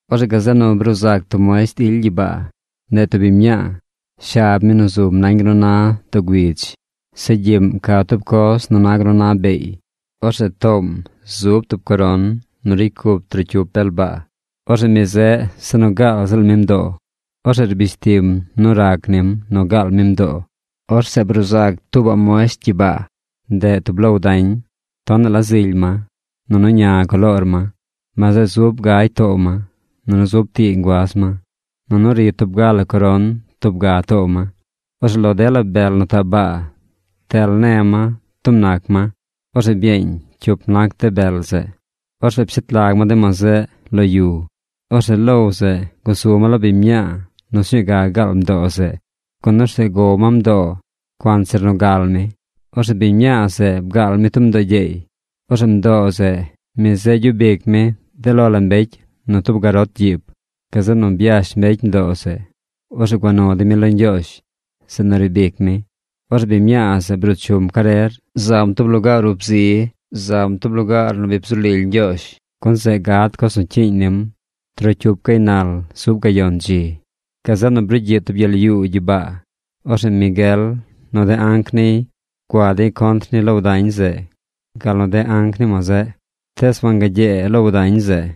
Orzeꞌ gazeꞌ nu bruu zac tub muesht ily gyibaa. Ndeꞌ tub biñ mñaa. Shab mi nu zum nañ gal nu na doo güidz. Zeꞌ gyiꞌm ca tub coz nu na gal nu na beey. Orzeꞌ toom zub tub coron nu ricy cup trocyup bel baa. Orzeꞌ mi zeꞌ se nu gaal ziꞌl mi mdoo. Orzeꞌ rbish tim nu rac nim nu gaal mi mdoo. Orzeꞌ bruu zacaꞌ tuubaꞌ muesht gyibaa. Ndeꞌ tub low dañ. Tonaꞌ la zily ma. Nunu ña coloor ma. Ma zeꞌ zub gagy too ma. Nunu zub tii nguaz ma. Nunu ri tub ga la coron tub ga too ma. Orzeꞌ lo dela bel nu taꞌ baa ptel ne ma tub nac ma. Orzeꞌ byeeñ cyup nac de bel zeꞌ. Orzeꞌ pshet lag ma de ma zeꞌ lo yu. Orzeꞌ low zeꞌ gusu ma lo biñ mñaa nu sñuu ga gal mdoo zeꞌ, gun orzeꞌ gow ma mdoo cuanzir nu gal mi. Orzeꞌ biñ mñaa zeꞌ bgaal mi tub mdoo gyeey. Orzeꞌ mdoo zeꞌ, mi zeꞌ gyub ic mi de lo la mbecy nu tub garot gyiib. Gazeꞌ nu byash mbecy mdoo zeꞌ. Orzeꞌ gua nu dey mi lo Ñgyoozh, zeꞌ nu riib ic mi. Orzeꞌ biñ mñaa zeꞌ bruu chum carer zam tub lugaar ub zi. Zam tub lugaar nu bi bzu lily Ñgyoozh. Gun zeꞌ gad coz nu cyiiñ nim trocyup gaynal zub gayon dzi. Gazeꞌ nu brugyiꞌ tub gyel yuu gyibaa. Orzeꞌ Miguel nu de anc niy gua dey contr ni low dañ zeꞌ gal nu de anc ni ma zeꞌ. Tees wangagyee low dañ zeꞌ.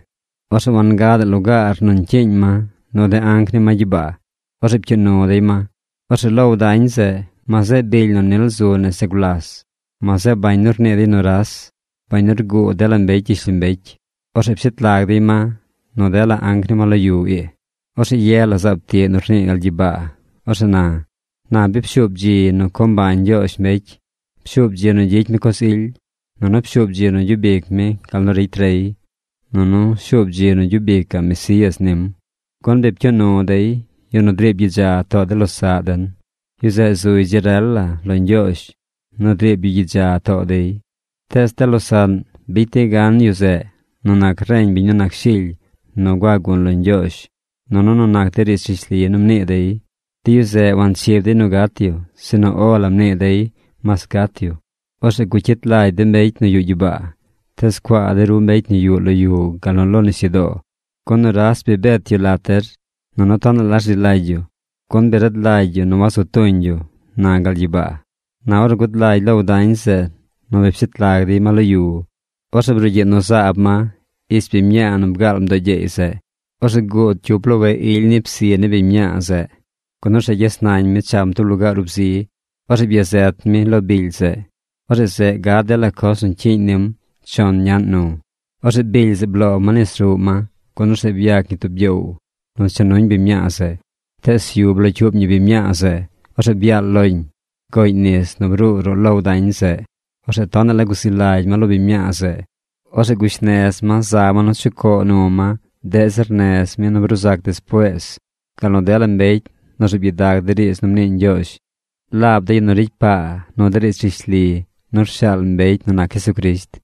Orzeꞌ wangadaꞌ lugaar nu ñcyiiñ ma nu de anc ni ma gyibaa. Orzeꞌ pcyuu nu dey ma. Orzeꞌ laab low dañ zeꞌ, ma zeꞌ bily nu nil zu nese gulas. Ma zeꞌ bañ nu rnii dey nuras, bañ nu rguu dela mbecy gyishlombecy. Orzeꞌ pshet lag dey ma nu dela anc ni ma lo yu ii. Orzeꞌ ye la zaab tiꞌ nu rnii gal gyibaa. Orzeꞌ na: ―Na bi pshuub dzi nu co mbañ Ñgyoozh mbecy. Pshuub dzi nu gyicy mi coz ily, nunu pshuub dzi nu gyub ic mi gal nu ricy rey. Nunu shuub dzi nu gyub icaꞌ Mesías nim. Gun bi pcyuu nu dey yu nu driib gyidza too de losaꞌ den. Yu zeꞌ zuy dzi rel la lo Ñgyoozh nu driib yu gyidza too dey. Tees de losaꞌn bicy dey gan yu zeꞌ nu nac reñ biñ nu nac Shily nu gua gun lo Ñgyoozh nunu nu nac de riidz rishli nu mnii dey. De yu zeꞌ wanchib dey nu gat yu, sinu “O la” mnii dey mas gat yu. Orzeꞌ gucyit lagy de mbecy nu yuꞌ gyibaa. Tees cuaa de ru mbecy nu yuꞌ lo yu gal nu lo nisyudoo. Gun nuras bi bet yu lat der. Nunu tonaꞌ la rzi lagy yu, gun bi rad lagy yu nu wazu tuñ yu ―na gal gyibaa. Na ornu gud lagy low dañ zeꞌ nu bi pshet lag dey ma lo yu, orzeꞌ brugyiꞌ nu zaab ma ich biñ mñaa nu bgaal mdoo gyeey zeꞌ. Orzeꞌ guud cyup loweꞌ ily ni psi ni biñ mñaa zeꞌ, gun orzeꞌ gyes nañ mi cham tub lugaar ub zi. Orzeꞌ byazet mi lo bily zeꞌ. Orzeꞌ zeꞌ gad dela coz nu cyiiñ nim chon ñaꞌn nu. Orzeꞌ bily zeꞌ bloo ma nis ruꞌ ma, gun orzeꞌ byac ñi tub gyoow nu cha nuñ biñ mñaa zeꞌ. Tees yu blocyuub ñi biñ mñaa zeꞌ. Orzeꞌ byaal loñ. Goꞌñ nis nu bruu ruꞌ low dañ zeꞌ. Orzeꞌ tonaꞌ la guzi lagy ma lo biñ mñaa zeꞌ. Orzeꞌ gush nez ma za ma nu chucoo nu ma deꞌ zir nez mi nu bruu zac despuees, gal nu dela mbecy nu rzuub gyidag de riidz nu mnii Ñgyoozh, laab de yu nu ricy paa nu de riidz rishli nu rshaal mbecy nu nac Jesucrisht.